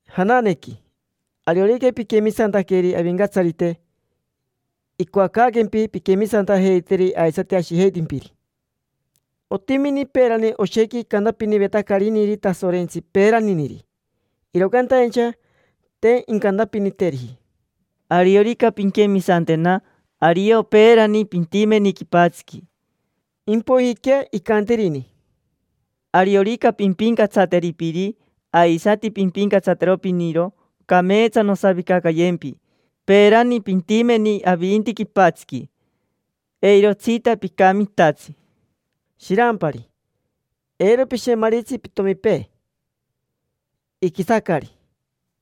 Jananequi, ariorica piquemisantaqueri Avincatsarite, icoacaaquempi pinquemisantajeiteri aisati ashijeitimpiri. Otimini peerani oshequi icantapinivetacariniri Tasorentsi peeraniniri, iro cantaincha te incantapiniteriji: “Ariorica pinquemisantena, ario peerani pintimeni quipatsiqui”. Impoijiquea icantirini: “Ariorica pimpincatsateri piri, aisati pimpincatsatero piniro, cameetsa nosavicacayempi; peerani pintimeni avinti quipatsiqui, eirotsita picamitatsi”. Shirampari, eiro pishemaritsi pitomipee, iquisacari;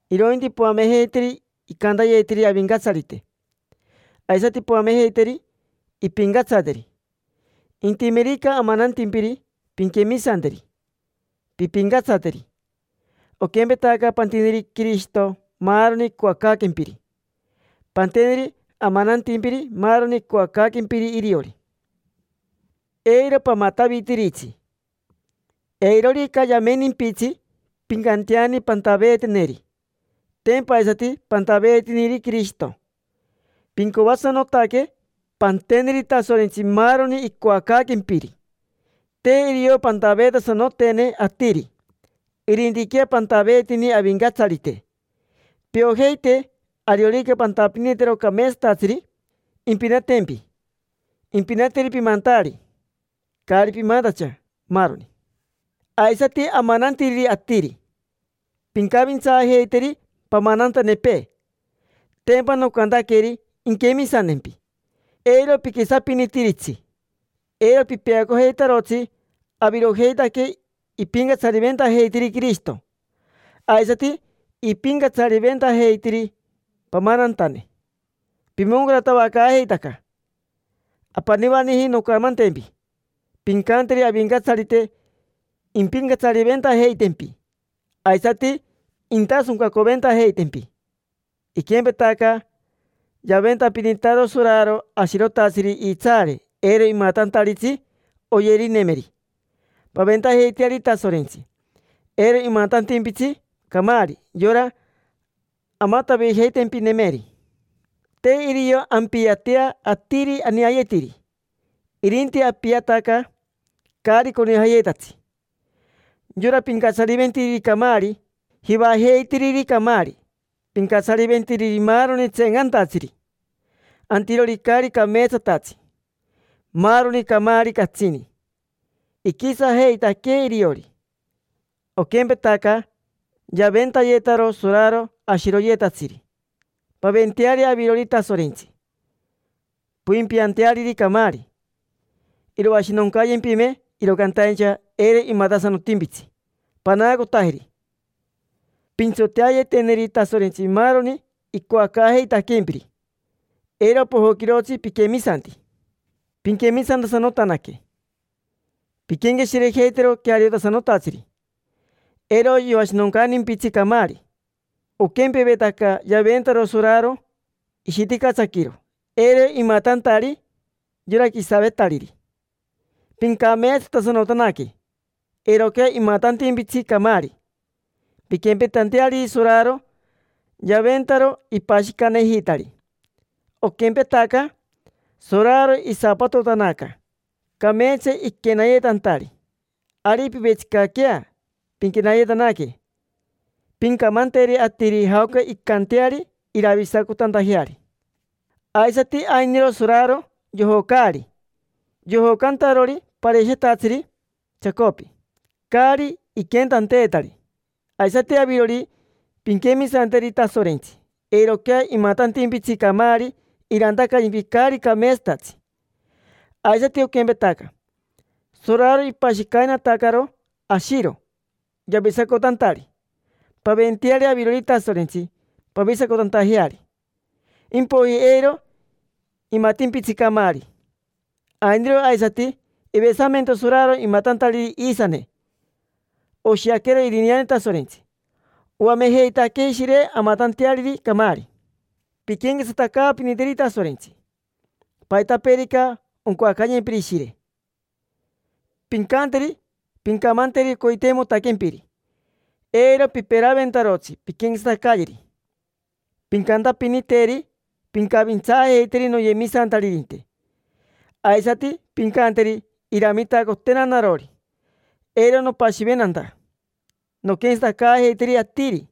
irointi poamejeiteri icantayetiri Avincatsarite, aisati poamejeiteri impincatsateri. Intimerica amanantimpiri, pinquemisanteri, pimpincatsateri. Oquempetaca pantiniri Quirishito maaroni icoacaaquempiri, panteneri amanantimpiri maaroni icoacaaquempiri iriori. Eiro pamatavitiritsi. Eirorica yamenimpitsi, pincanteani pantaveeteneri: tempa aisati pantaveetiniri Quirishito. Pincoasanotaque panteneri Tasorentsi maaroni icoacaaquempiri. Te irio pantaveetasanotene atiri, irintiquea pantaveetini Avincatsarite. Piojeite ariorica pantapinitero cameetsatatsiri, impinatempi. Impinateri pimantaari, caari pimantacha, maaroni. Aisati amanantiriri atiri: pincavintsaajeiteri pamanantanepee, tempa nocantaqueri inquemisantempi. Eiro piquisapinitiritsi. Eiro pipeacojeitarotsi: avirojeitaque ipincatsariventajeitiri Quirishito, aisati ipincatsariventajeitiri pamanantane: pimoncaratavacaajeitaca. Apanivaniji noncamantempi: pincanteri Avincatsarite impincatsariventajeitempi, aisati intasoncacoventajeitempi. Iquempetaca yaventapinitaro soraro ashirotatsiri iitsaare eiro imatantaritsi oyerinemeri, paventajeiteari Tasorentsi eiro imatantimpitsi camaari, yora amatavijeitempinemeri. Te irio ampiatea atiri aneayetiri, irinti apiataca caari conijayetatsi: yora pincatsariventiriri camaari, jivajeitiriri camaari, pincatsariventiriri maaroni tseencantatsiri, antirori caari cameetsatatsi, maaroni camaari catsini. Iquisajeitaquee iriori. Oquempetaca yaventayetaro soraro ashiroyetatsiri, paventeari avirori Tasorentsi poimpianteariri camaari. Iroashinoncayempime, iro cantaincha eiro imatasanotimpitsi, panaacotajeri. Pintsoteayeteneri Tasorentsi maaroni icoacaajeitaquempiri; eiro pojoquirotsi piquemisanti. Pinquemisantasanotanaque, pinquenqueshirejeitero queariotasanotatsiri eiro yoashinoncantimpitsi camaari: oquempevetaca yaventaro soraro ishiticatsaquiro eiro imatantari yora quisavetariri. Pincameetsatasanotanaque eiroquea imatantimpitsi camaari: pinquempetanteariri soraro, yaventaro ipashicanejitari. Oquempetaca soraro isapatotanaca cameetsa iquenayetantari, ari pivetsicaquea pinquenayetanaque, pincamanteri atiri jaoca incanteari iravisacotantajeari. Aisati ainiro soraro yojocaari, yojocantarori parashetatsiri chacopi caari iquentanteetari. Aisati avirori, pinquemisanteri Tasorentsi, eiroquea imatantimpitsi camaari irantacayempi caari cameetsatatsi. Aisati, oquempetaca soraro ipashicainatacaro ashiro yavisacotantari, paventeari avirori Tasorentsi pavisacotantajeari: impoiji eiro imatimpitsi camaari. Ainiro aisati ivesamento soraro imatantariri iisane: oshiaquero irineane Tasorentsi oamejeitaquee Ishire amatanteariri camaari. Pinquenquetsatacaapiniteri Tasorentsi. Paitapeerica oncoacayempiri Ishire, pincanteri. Pincamanteri coiteimotaquempiri. Eiro piperaventarotsi pinquenquetsatacayeri: pincantapiniteri: “Pincavintsaajeiteri noyemisantaririnte”. Aisati pincanteri iramitacotena narori, eiro nopashiventanta nonquenquetsatacaajeiteri atiri.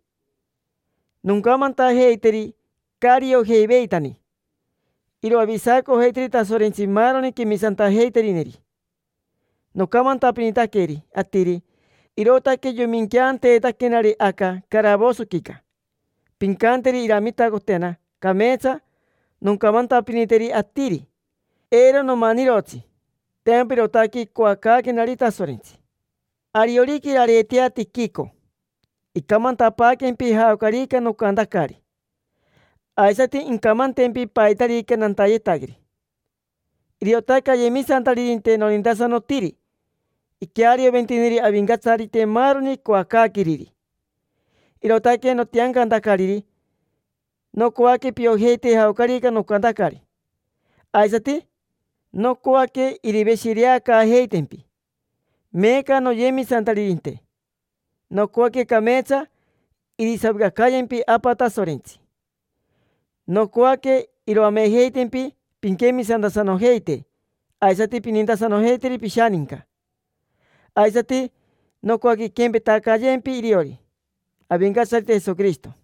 Noncamantajeiteri caari iojeiveitani: iroavisacojeiteri Tasorentsi maaroni quemisantajeiterineri. Nocamantapinitaqueri atiri, irootaque yoiminqueanteetaquenari aca caravosoquica. Pincanteri iramitacotena cameetsa noncamantapiniteri atiri, eiro nomanirotsi. Tempa irootaque icoacaaquenari Tasorentsi. Ariorica irareetea Tiquico, incamantapaaquempi jaocarica nocantacari, aisati incamantempi paitarica nantayetaqueri. Iriotaque ayemisantaririnte nonintasanotiri, iquearioventiniri Avincatsarite maaroni icoacaaqueriri. Irootaque notiancantacariri, nocoaque piojeite jaocarica nocantacari. Aisati nocoaque iriveshireacaajeitempi. Meeca, noyemisantaririnte, nocoaque cameetsa irisavicacayempi Apa Tasorentsi, nocoaque iroamejeitempi pinquemisantasanojeite aisati pinintasanojeiteri pishaninca. Aisati nocoaque inquempetacayempi iriori Avincatsarite Jesoquirishito.